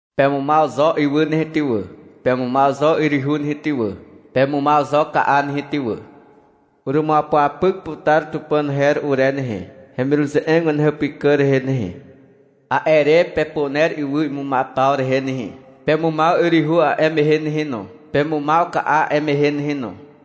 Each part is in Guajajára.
— Pemumaw zo ywy nehe ty wà, pemumaw zo yryhu nehe ty wà, pemumaw zo ka'a nehe ty wà, i'i wanupe. — Urumuapyapyk putar Tupàn her ure nehe, hemiruze'eg wanehàpykà rehe nehe, i'i wanupe. — A'e re pepuner ywy imumaw paw rehe nehe. Pemumaw yryhu a'e mehe nehe no. Pemumaw ka'a a'e mehe nehe no, i'i wanupe.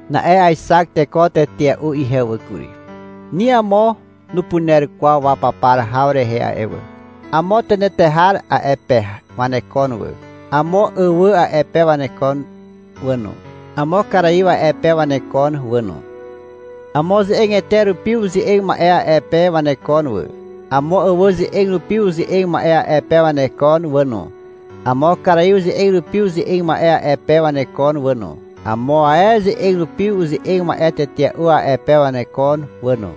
Na'e aexak teko tetea'u ihe wà kury. Ni amo nupuner kwaw wapapar haw rehe a'e wà. Amo tenetehar a'e pe wanekon wà, amo àwà a'e pe wanekon wà no, amo karaiw a'e pe wanekon wà no. Amo ze'egete rupi uze'eg ma'e a'e pe wanekon wà, amo àwà ze'eg rupi uze'eg ma'e a'e pe wanekon wà no, amo karaiw ze'eg rupi uze'eg ma'e a'e pe wanekon wà no, amo ae ze'eg rupi uze'eg ma'e tetea'u a'e pe wanekon wà no.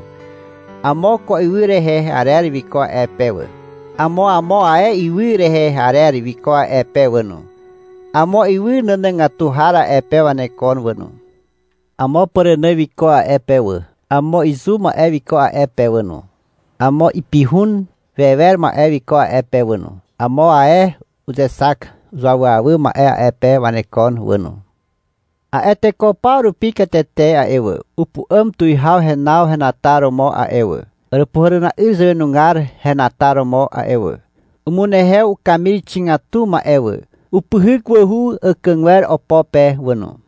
Amo ko ywy rehe arer wiko a'e pe wà, amo amo ae ywy rehe arer wiko a'e pe wà no. Amo ywy nànàgatu har a'e pe wanekon wà no. Amo pàrànà wiko a'e pe wà, amo izu ma'e wiko a'e pe wà no, amo ipihun wewer ma'e wiko a'e pe wà no. Amo ae uzexak uzuawyawy ma'e a'e pe wanekon wà no. A'e teko paw rupi katete a'e wà, upu'àm tuwihaw henaw henataromo a'e wà, Àràpuhàràna'yr zàwenugar henataromo a'e wà. Umunehew ukamir xigatu ma'e wà. Upyhyk wàhu àkàgwer opo pe wà no.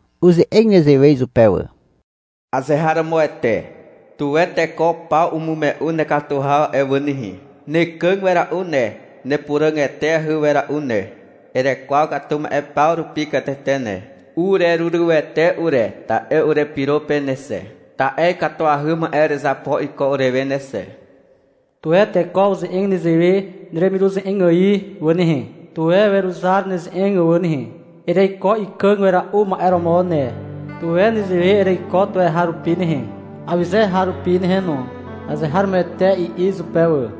Uze'eg nezewe izupe wà. Azeharomoete. Tuwe teko paw umume'u nekatu haw a'e wà nehe. Nekàg wera'u ne, nepuràg eteahy wera'u ne. Erekwaw katu ma'e paw rupi katete ne. Urerurywete ure, ta'e urepyro pe ne xe, ta'e ikatuahy ma'e erezapo iko urewe ne xe. Tuwe teko uze'eg newe neremiruze'eg ài wà nehe, Tuwe weruzar neze'eg wà nehe. Ereiko ikàg wera'u ma'e romo ne. Tuwe nezewe ereiko tuweharupi nehe, Awyze har rupi nehe no. Azeharomoete, i'i izupe wà.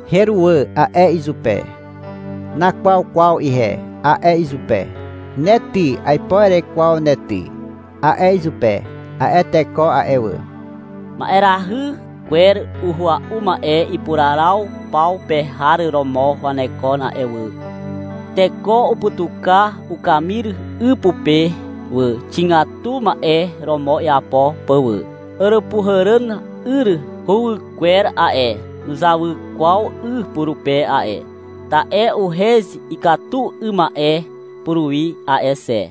— Heruwà, a'e izupe. — Nakwaw kwaw ihe, a'e izupe. — Ne ty, aipo erekwaw ne ty, a'e izupe. — A'e teko a'e wà. Ma'erahy kwer uhua'u ma'e ipuraraw paw pe har romo wanekon a'e wà, i'i ihewe. Teko uputuka ukamir 'y pupe wà, xigatu ma'e romo iapo pà wà. Àràpuhàràna'yr huwykwer a'e, nuzawy kwaw 'y purupe a'e. Ta'e uhez ikatu 'ym ma'e puruwi a'e xe.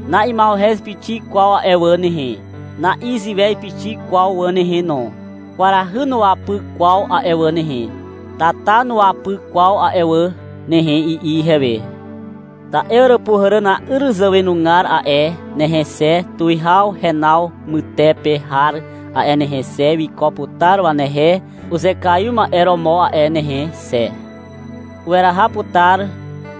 — Na'ima'uhez pixik kwaw a'e wà nehe. Na'iziwez pixik kwaw wà nehe no, i'i ihewe. — Kwarahy nuwapy kwaw a'e wà nehe. Tata nuwapy kwaw a'e wà nehe, i'i ihewe. — Ta'e Àràpuhàràna'yr zàwenugar a'e nehe xe, tuwihaw henaw mytepe har a'e nehe xe, wiko putar wanehe uzekaiw ma'e romo a'e nehe xe, i'i ihewe. — Weraha putar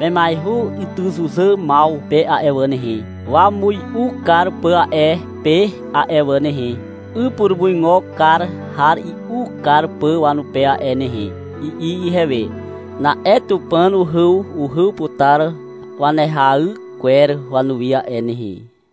wemiaihu ytyzuzàmaw pe a'e wà nehe, wamui'u kar pà a'e pe a'e wà nehe, 'y purumuigo kar har i'u kar pà wanupe a'e wà nehe, i'i ihewe. — Na'e Tupàn uhyuhyw putar wanehay kwer wanuwi a'e nehe, i'i ihewe.